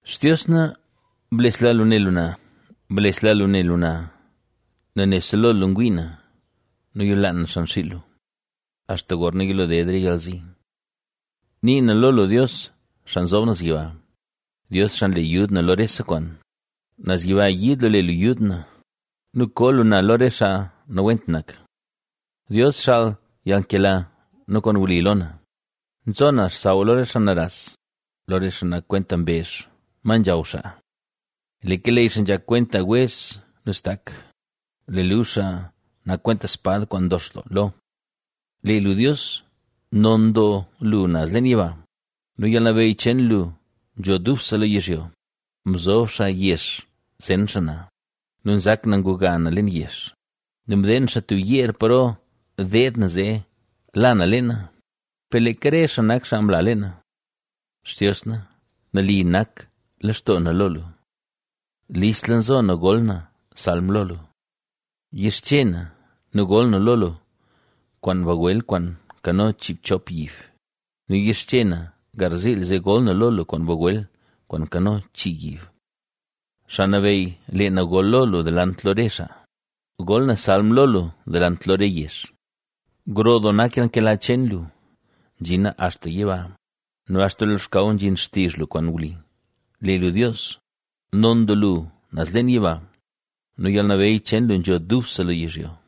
Xtios na, blesla lu ne lu na, blesla lu ne lu na, nel nebse lo lu ngwii na nu yolaan na xan xiil lu, axta gorna yilo ded re yalzi. Ni na lo Dios, Xaa Nzob Naz Yiba, Dios xaa nle yud na lo rese kwaan. Naz yiba yiid lu le lu yud na nu koo lu na lo re xaa nawent nak. {Mbaz} ¡Dios xaal yalnkela nu kwaan wli lo na! Nzo na xsaw lo re xaa naras, lo re xaa nak kwenta mbezh, ma nzhaw xaa. Lee keleyy xaa nzhak kwenta wez nu stak, lee luzh xaa nak kwenta spad kwaan ndox doo lo. ¡Lee lu Dios, non doo lu naz leen yiba nu yalnabeyy cheen lu nzho dubse lo yizhyo! Mzob xaa yex zen xaa na nu nzak na nguga na leen yex nu mdeen xaa tub yeer paro deed na zee la na leena, per leeka re xaa nak xaa mla leena. Xtios na, nali nak lextoo na lo lu, listla nzo na gol na salm lo lu. Yixche na nu gol na lo lu kwaan bagwel kwaan nkano chiibchop yib nu yixche na garziil zee gol na lo lu kwaan bagwel kwaan nkano chii yib. Xaa Nabeyy lee na gol lo lu delant lo re xaa, gol na salm lo lu delant lo re yezh, Gro doo nak yalnkela cheen lu, nzhina axta yiba ¡nu axta lo xkaw nzhin xtizh lu kwaan wli! ¡Lee lu Dios, non doo lu naz leen yiba nu yalnabeyy cheen lu nzho dubse lo yizhyo!